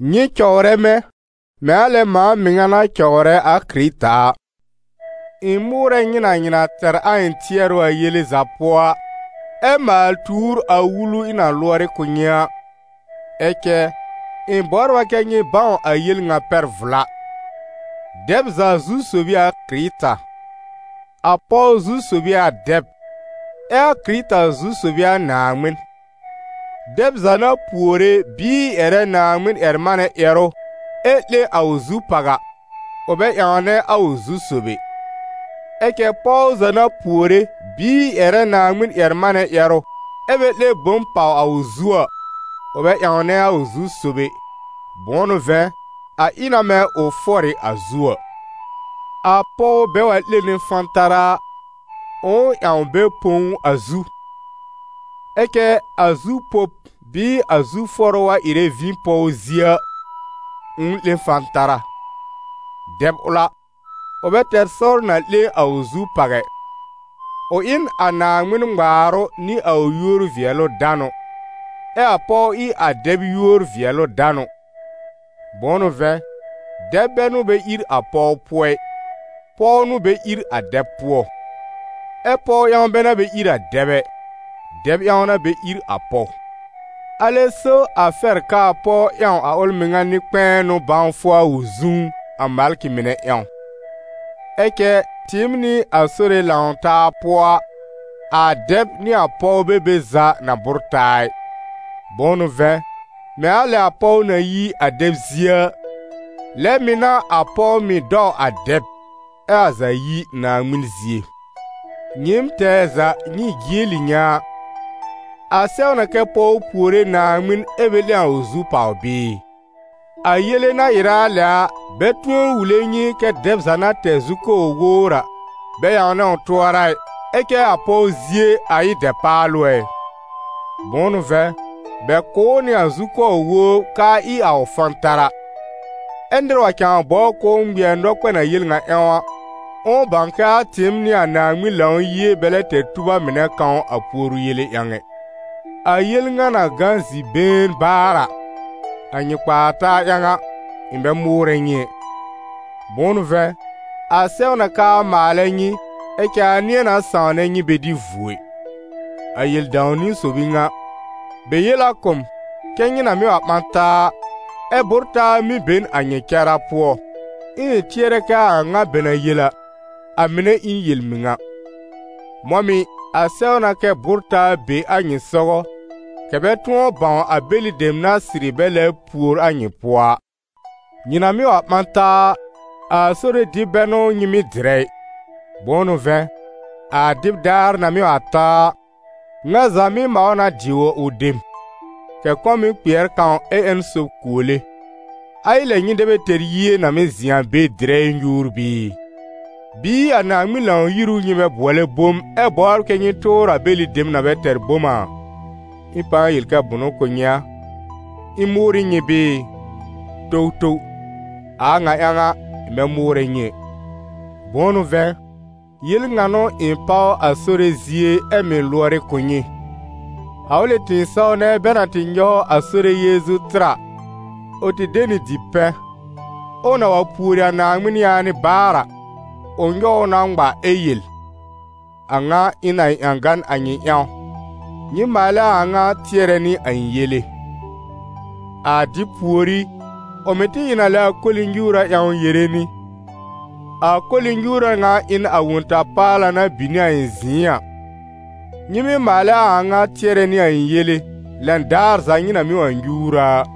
Nyɩ cɔwrɛ mɛ̃, mɛ̃ a lɛ mãa mɩŋa na cɔwrɛ a Kɩrɩta a. Ɩ̃ mʋʋrɛ nyɩ na nyɩ na tɛr a ɩ̃ tɩɛrʋ a yele za pʋɔ a, ɛ maal tuur a wulu ɩ̃ na lʋɔrɩ kʋ̀ nyɩ a. Ɛ cɛ, ɩ̃ bɔbr a kɛ nyɩ bãw a yel ŋa pɛr vla: dɛb za zu-sob ɩ a Kɩrɩta; a pɔw zu-sob ɩ a dɛb, ɛ a Kɩrɩta zu-sob ɩ a Naaŋmɩn. Dɛb za na puore bɩɩ ƴɛrɛ Naaŋmɩn-ƴɛr-manɛ ƴɛrʋ ɛ 'lẽ a ʋ zu pàw a, ʋ bɛ ƴãwnɛ a ʋ zu-sob ɛ. Ɛ cɛ pɔw za na puore bɩɩ ƴɛrɛ Naaŋmɩn-ƴɛr-manɛ ƴɛrʋ ɛ bɛ 'lẽ bom pàw a ʋ zu a, ʋ bɛ ƴãwnɛ a ʋ zu-sob ɛ, bʋ̃ʋ n'ʋ vɛ̃, a ɩ na mɛ̃ ʋ fɔr ɩ a zu a. A pɔw bɛ wa 'lẽne fãtara a, ʋ̃ʋ ƴãw bɛ põ ʋ a zu. Ɛ cɛ a zu pob bɩɩ a zu fɔrʋ wa ɩrɛ vĩ pɔw zie a, ʋ̃ʋ 'lẽ fãtara. Dɛb ʋl a, ʋ bɛ tɛr sɔr na 'lẽ a ʋ zu pàw ɛ; ʋ ɩ n a Naaŋmɩn ŋmaarʋ nɩ a ʋ yúor-vɩɛlʋ-danʋ, ɛ a pɔw ɩ a dɛb yúor-vɩɛlʋ-danʋ. Bʋ̃ʋ n'ʋ vɛ̃, dɛb bɛ n'ʋ bɛ ír a pɔw pʋɔ ɩ, pɔw n'ʋ bɛ ír a dɛb pʋɔ. Ɛ pɔw ƴãw bɛ n'a bɛ ír a dɛb ɛ, dɛb ƴãw n'a bɛ ír a pɔw. Alɛ so a fɛr kɛ a pɔw ƴãw a ʋl mɩŋa nɩ-kpɛ̃ɛnʋ bãwfʋ a ʋ zũú, a malkɩ mɩnɛ ƴãw. Ɛ cɛ tɩɩm nɩ a Sore lãw-taa pʋɔ a, a dɛb nɩ a pɔw bɛ be za na bʋ́r taa ɩ. Bʋ̃ʋ n'ʋ vɛ̃, mɛ̃ a lɛ a pɔw na yi a dɛb zie a, lɛ mɩ̀ n'a a pɔw mɩ̀ dɔw a dɛb, ɛ a za yi Naaŋmɩn zie. Nyɩɩm tɛɛ za nyɩ jieli nyɛ̃ a: a sɛw na kɛ pɔw puore Naaŋmɩn ɛ bɛ 'lẽ a ʋ zu pàw bɩɩ? A yele na ɩrɛ a lɛ a, bɛ tʋ̃ɔ wule nyɩ kɛ́ dɛb na tɛr zukɔbr wowr a, bɛ ƴãwnɛ ʋ tʋɔra ɩ, ɛ cɛ a pɔw zie, a ɩ dɛpaalʋ ɛ? Bʋ̃ʋ n'ʋ vɛ̃, bɛ kʋ̀ ʋ nɩ a zukɔbr wowr k'aa ɩ a ʋ fãtara. Ɛ nɩr wa cãa bɔbr k'ʋʋ ŋmɩɛr nɔkpɛn a yel ŋa ƴãw a, ʋ̃ʋ bãw k'aa tɩɩm nɩ a Naaŋmɩn Lãw-yie bɛ lɛ tɛr tub a mɩnɛ kãw a puoru yele ƴãw ɛ. A yel ŋa na gã zi-been baar a, a nyɩ kpaa-taa ƴãw a, ɩ̃ bɛ mʋʋrɛ nyɩ ɛ. Bʋ̃ʋ n'ʋ vɛ̃, a sɛw na k'aa maalɛ nyɩ, ɛ cɛ a nɩ̃ɛ na sãwnɛ nyɩ bɛ dɩ vuo ɩ. A yel dãw-niwn sob ɩ ŋa: bɛ yel a kʋ̀ m, kɛ́ nyɩ na mɩ́ wa ɓã taa a, ɛ́ bʋ́r-taa mɩ́ be n a nyɩ cara pʋɔ, ɛ ɩ̃ tɩɛr kɛ a a ŋa bɛ na yel a, a mɩnɛ ɩ n yel-mɩŋa. Mɔ̃ mɩ̀, a sɛw na kɛ́ bʋ́r-taa be a nyɩ sɔgɔ, kɛ̀ bɛ tʋ̃ɔ bãw a bɛlɩ dem na sɩrɩ bɛ lɛbr pùor a nyɩ pʋɔ a. Nyɩ na mɩ́ wa ɓã taa a, a Sore dɩb bɛ n'ʋ nyɩ mɩ́ dɩrɛ ɩ. Bʋ̃ʋ n'ʋ vɛ̃, a dɩb daar na mɩ́ wa ta a, ŋa za mɩ́ maw na dɩ a ʋ dem, kɛ̀ kɔ̃ mɩ́ kpɩɛr kãw ɛ ƴẽn sob kuole. A ɩ lɛ, nyɩ dɛ bɛ tɛr yie na mɩ́ zɩ̃ a be dɩrɛ ɛ nyuur bɩɩ? Bɩɩ a Naaŋmɩn Lãw-yir ʋ nyɩ bɛ bʋɔlɛ bom, ɛ bɔbr kɛ nyɩ tʋʋr a bɛlɩ dem na bɛ tɛr bom a? Ɩ̃ pãa yel kɛ bʋnʋ kʋ̀ nyɩ a? Ɩ̃ mʋʋrɩ nyɩ bɩɩ? Towtow! A a ŋa ƴãw a, ɩ̃ bɛ mʋʋrɛ nyɩ ɛ. Bʋ̃ʋ n'ʋ vɛ̃, yel ŋa n'ʋ ɩ̃ páw a Sore zie ɛ mɩ̀ lʋɔrɩ kʋ̀ nyɩ: a ʋlɩ tɩ̃ɩsɔw nɛ bɛ na tɩ nyɔw a Sore Yeezu tɩr a, ʋ tɩ de nɩ dipɛ̃, ɛ ʋ na wa pùori a Naaŋmɩn yaanɩ baar a, ʋ nyɔw ʋ na ŋma ɛ yel: «A ŋa ɩ n a ɩ̃ ƴãgan a nyɩ ƴãw, nyɩ maalɛ a a ŋa tɩɛrɛ nɩ a ɩ̃ yele.» A dɩb pùorí, ʋ mɩ̀ tɩ ɩ n a lɛ a koli-nyuura ƴãw yere nɩ: «A koli-nyuura ŋa ɩ n a Wõ-ta-paala na bin nɩ a ɩ̃ zɩ̃ɩ a, nyɩ mɩ́ maalɛ a a ŋa tɩɛrɛ nɩ a ɩ̃ yele, lɛn daar za nyɩ na mɩ́ wa nyuur a a.»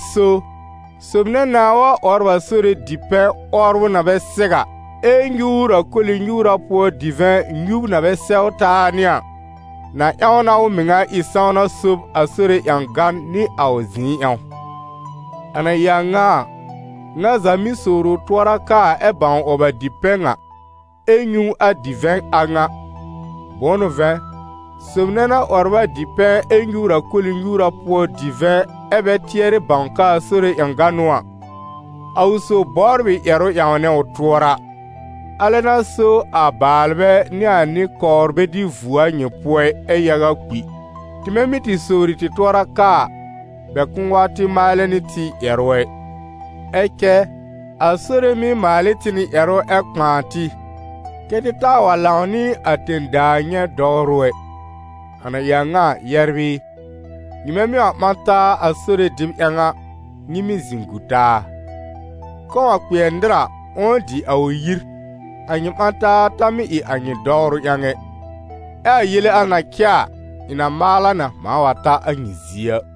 Alɛ so, sob nɛ nãá wa 'wɔbr a Sore dipɛ̃, 'wɔbrʋ na bɛ sɛw a, ɛ nyuur a koli-nyuura pʋɔ divɛ̃, nyub na bɛ sɛw taa nɩ a, na ƴãw na ʋ mɩŋa ɩ sãwna sob a Sore ƴãgan nɩ a ʋ zɩ̃ɩ ƴãw. A na ɩ a ŋa a, ŋa za mɩ́ sowr ʋ tʋɔra kaa ɛ bãw 'wɔb a dipɛ̃ ŋa, ɛ nyũ a divɛ̃ a ŋa; bʋ̃ʋ n'ʋ vɛ̃, sob nɛ na 'wɔbr a dipɛ̃ ɛ nyuur a koli-nyuura pʋɔ divɛ̃, ɛ bɛ tɩɛrɩ bãw k'aa Sore ƴãgan n'ʋ a, a ʋ sob bɔbr ɩ ƴɛrʋ ƴãwnɛ ʋ tʋɔra. Alɛ n'a so a baalbɛ nɩ a nɩ-kɔwr bɛ dɩ vuo a nyɩ pʋɔ ɩ, ɛ yaga kpi. Tɩmɛ mɩ́ tɩ sowri tɩ tʋɔra kaa a, bɛ kʋ̃ʋ wa tɩ maalɛ nɩ tɩ ƴɛrʋ ɛ. Ɛ cɛ a Sore mɩ́ maal ɩ tɩ nɩ ƴɛrʋ ɛ kpãa tɩ, kɛ́ tɩ taa wa lãw nɩ a tẽ-daa nyɛ̃ dɔwrʋ ɛ. A na ɩ a ŋa a, yɛbr ɩ, nyɩmɛ mɩ́ wa ɓã taa a Sore dɩb ƴãw a, nyɩ mɩ́ zɩ̃ gu taa; kɔ̃ wa kpɩɛr nɩr a, ʋ̃ʋ dɩ a ʋ yir, a nyɩ ɓã-taa ta mɩ́ ɩ a nyɩ dɔwrʋ ƴãw ɛ. Ɛ a yele al na cɛ a, ɩ̃ na maal a na mãa wa ta a nyɩ zie a.